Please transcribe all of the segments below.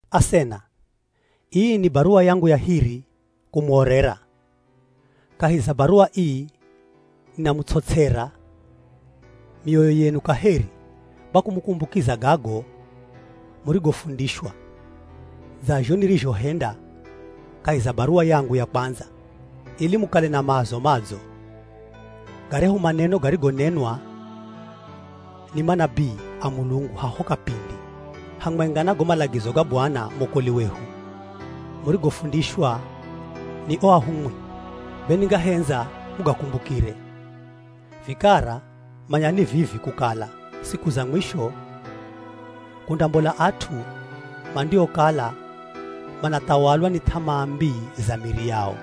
Asena, ii ni baruwa yangu ya hiri kumuorera. Kahi za baruwa ii ninamuts'ots'era mioyo yenu kaheri kwa kumukumbukiza gago murigofundishwa, dza zho nirizhohenda kahi za baruwa yangu ya kwandza, ili mukale na maazo madzo. Garyahu maneno garigonenwa ni manabii a Mulungu haho kapindi, hamwenga na go malagizo ga Bwana mwokoli wehu, murigofundishwa ni o ahumwi, be ningahendza mugakumbukire. Vikara manyani vivi kukala siku za mwisho, kundambola at'u mandiokala manathawalwa ni th'amaa mbii za miri yao.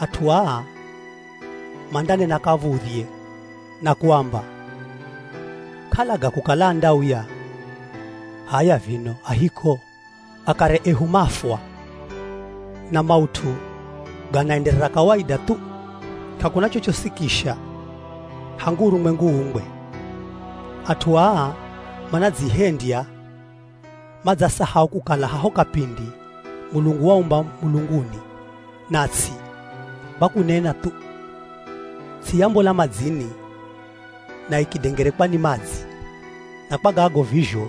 At'u aa mandanena kav̱udhye na kuamba, “K'alaga kukala andauya, h'aya vino a hiko? Akare ehu mafwa, na maut'u ganaenderera kawaida thu. K'akuna chochosi kisha hangu urumwengu uumbwe.” At'u aa manadzihendya madzasahau kukala haho kapindi, Mulungu waumba mulunguni na ts'i kwa kunena thu. Ts'i yambola madzini na ikidengerekwa ni madzi. Na kwa gago vizho,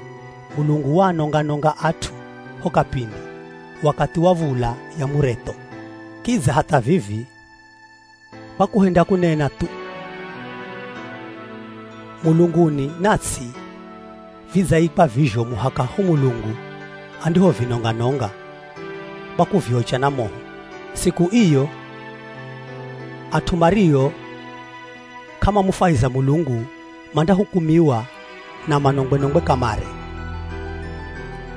Mulungu waanonga-nonga at'u ho kapindi wakathi wa v̱ula ya muretho. Kidza hatha vivi, kwa kuhenda kunena thu, mulunguni na ts'i, vidzaikwa vizho muhaka ho Mulungu andihovinonga-nonga kwa kuviocha na moho. Siku iyo, at'u mario k'amamufwahiza Mulungu mandahukumiwa na manongwe-nongwe kamare.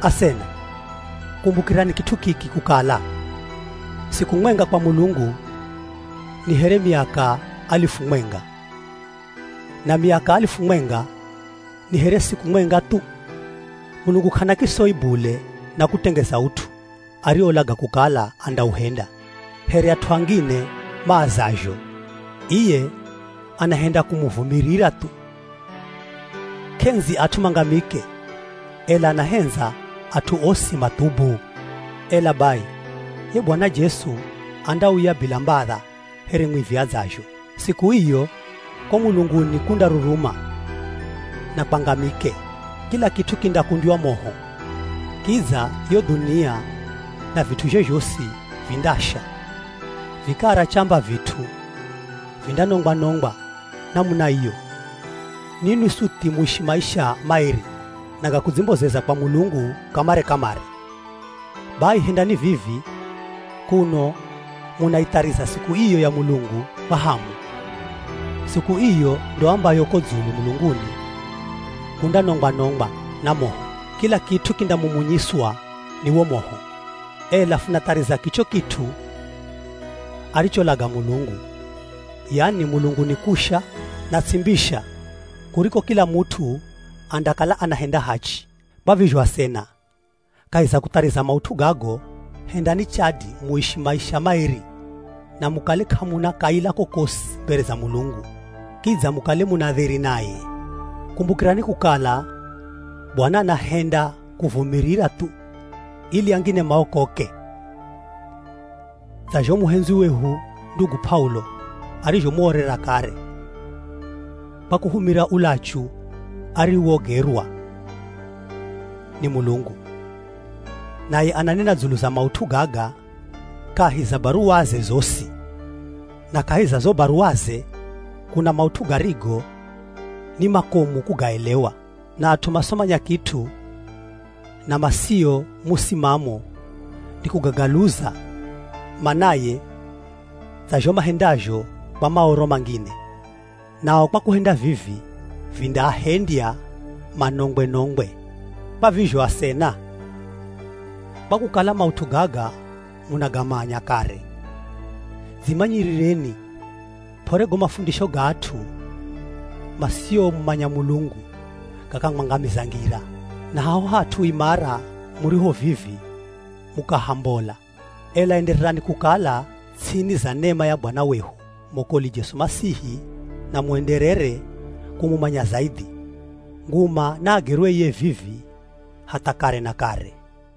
Asena, kumbukirani kit'u kiki kukala, siku mwenga kwa Mulungu ni here miaka alifu mwenga, na miaka alifu mwenga ni here siku mwenga thu. Mulungu k'ana kisoi bule na kutengeza ut'u ariolaga kukala andauhenda, here at'u angine maazazho. Iye anahenda kumuvumirira thu. K'endzi at'u mangamike, ela anahendza at'u osi mathubu. Ela bai, ye Bwana Jesu andauya bila mbadha here mwivi adzazho. Siku iyo, ko mulunguni kundaruruma na kwangamike. Kila kit'u kindakundywa moho. Kidza yo dhunia na vit'uzhe zhosi vindasha. Vikara chamba vit'u vindanongwa-nongwa namuna iyo, ninwi suthi muishi maisha maeri na ga kudzimbozeza kwa Mulungu kamare-kamare. Bai hendani vivi kuno munaithariza siku iyo ya Mulungu kwa hamu. Siku iyo ndo ambayo ko dzulu mulunguni kundanongwa-nongwa na moho. Kila kit'u kindamumunyiswa ni wo moho. Ela funathariza kicho kit'u aricholaga Mulungu, yani mulunguni kusha, na ts'i mbisha kuriko kila mut'u andakala anahenda hachi. Kwa vizho asena, kahi za kuthariza maut'u gago, hendani chadi muishi maisha maeri na mukale k'amuna kaila kokosi mbere za Mulungu, kidza mukale muna dheri naye. Kumbukirani kukala Bwana anahenda kuvumirira thu ili angine maokoke, dza zho muhendzwi wehu ndugu P'aulo arizhomuorera kare kwa kuhumira ulachu ariwogerwa ni Mulungu. Naye ananena dzulu za maut'u gaga kahi za baruwaze zosi. Na kahi za zo baruwaze, kuna maut'u garigo ni makomu kugaelewa, na at'u masomanya kit'u na masio musimamo nikugagaluza manaye dza zho mahendazho kwa Maoro mangine. Nao kwa kuhenda vivi, vindaahendya manongwe-nongwe. Kwa vizho asena, kwa kukala maut'u gaga munagamanya kare, dzimanyirireni p'ore go mafundisho ga at'u masiomumanya Mulungu gakamwangamiza ngira, na haho hat'u imara muriho vivi mukahambola. Ela endererani kukala ts'ini za nema ya Bwana wehu, mwokoli Jesu Masihi na muenderere kumumanya zaidhi. Nguma naagerwe iye vivi hatha kare na kare.